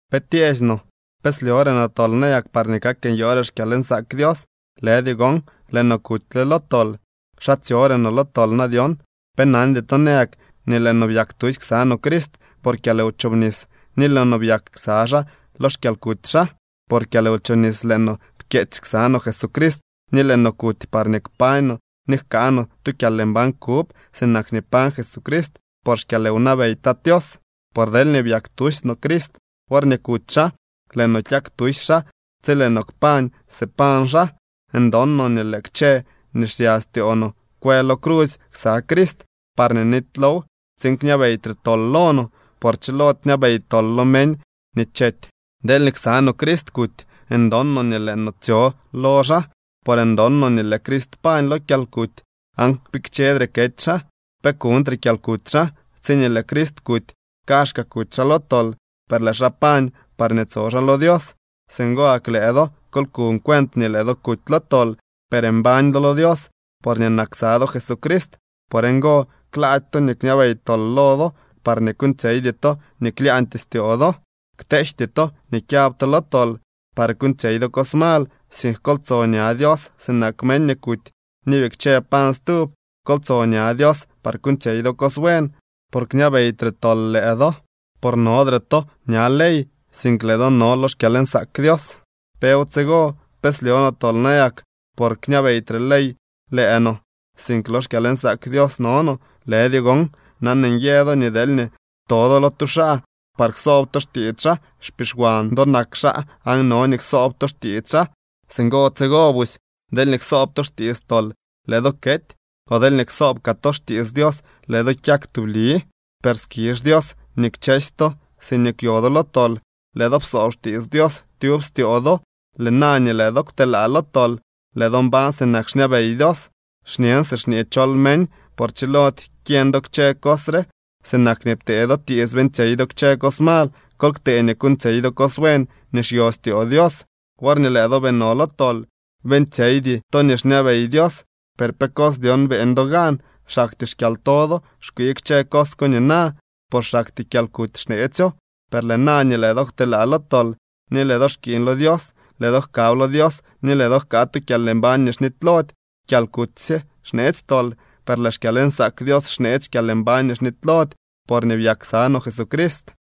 ¿Pe tyeesy no? ¿Pe slyore no tol nayak parñee kak nyoore xkyalnsaak Dios? ¡Lëdyo gon! Lëë no kutyle lo tol. ¿Xa tsyore no lo tol na dyon? ¿Pe nandy to nayak nii lëë no byak tusy ksa no Crist por kyalwchobnis, ni lëë no byak ksa xaa lo xkyalkuty xaa? Por kyalwchobnis lëë no pkyeetsy ksa no Jesucrist ni lëë no kuty parñee kpañ no ni jkaa no tu kyalmbañ kub, sinak nii pañ Jesucrist por xkyalwnabey Tat Tios. Por deelñee byak tusy no Crist worñee kuty xaa, lëë no kyak tusy xaa tsi lëë no kpañ si pañ xaa. Ndon no nii lëë kchë nii xsya styoo no kwë lo crusy ksa Crist parñee nitylow tsiin kñabeytre tol lo no. Por chilody kñabey tol lo meñ nii chety. Deelñee ksa no Crist kuty, ndon no nii lëë no tsyo lo xaa. Por ndon no nii lëë Crist pañ lo kyalkuty aan kpikchedre kety xaa. Pe kuñtre kyalkuty xaa. Tsiñee lëë Crist kuty, kaazhkaa kuty xaa lo tol, per lëë xaa pañ parñee tso xaa lo Dios. Singo gak lëë do, kol kuñ cuent nii lëë do kuty lo tol, per mbañ do lo Dios, porñee nak ksa do Jesucrist. Por ngo, klaady to nii kñabey tol lo do, parñee kuuñtsyeydy to nii klyaañtyee styoo do. Kteejty to nii kyab to lo tol par kuuñtsyey do cos mal, sink kol tso ña Dios sinak meñ nii kuty ni bikche pañ stub. Kol tso ña Dios par kuuñtsyey do cos buen. Por kñabeytre tol lëë do, por nodre to ña ley, sink lëë do no lo xkyalnsaak Dios. ¿Pew tsigo? ¿Pe slyo no tol nayak por xñabeytre ley lëë no, sink lo xkyalnsaak Dios no no? ¡Lëdyo gon! Nan nyë do nii deelñee to do lo tu xaa par ksoob to xtiits xaa, xpixwan do nak xaa aan no nii ksoob to xtiits xaa. Singo tsigo busy deelñee ksoob to xtiits tol, lëë do kety, o deelñee ksoob kaa to xtiits Dios, lëë do kyak tubli. Per skizh Dios nii kchësy to siñee kwyo do lo tol, lëë do psoob xtiits Dios tyub styoo do. Lëë na nii lëë do kwtelaa lo tol, lëë do mbañ sinak xñabey Dios. Xñen si xñee chol meñ, por chilody kyeñ do kchë cos re. Sinak nii ptee do tiits beeñtsyey do kchë cos mal, kol ktee nii kuuñtsyey do cos buen nii xyo styoo Dios. Worñee lëë do bii no lo tol, beeñtsyeydy to nii xñabey Dios. ¿Per pe cos dyon beeñ do gan? Xaktyee xkyalto do xkwii kchë cos ko nina. Por xaktyee kyalkuty xneetsyo. Per lëë na nii lëë do kwtelaa lo tol ni lëë do xkiiñ lo Dios, lëë do jkab lo Dios ni lëë do jkaa tu kyalmbañ nii xnitylody. Kyalkuty sye xneetsy tol, per lëë xkyalnsaak Dios xneetsy kyalmbañ nii xnitylody, porñee byak ksa no Jesucrist.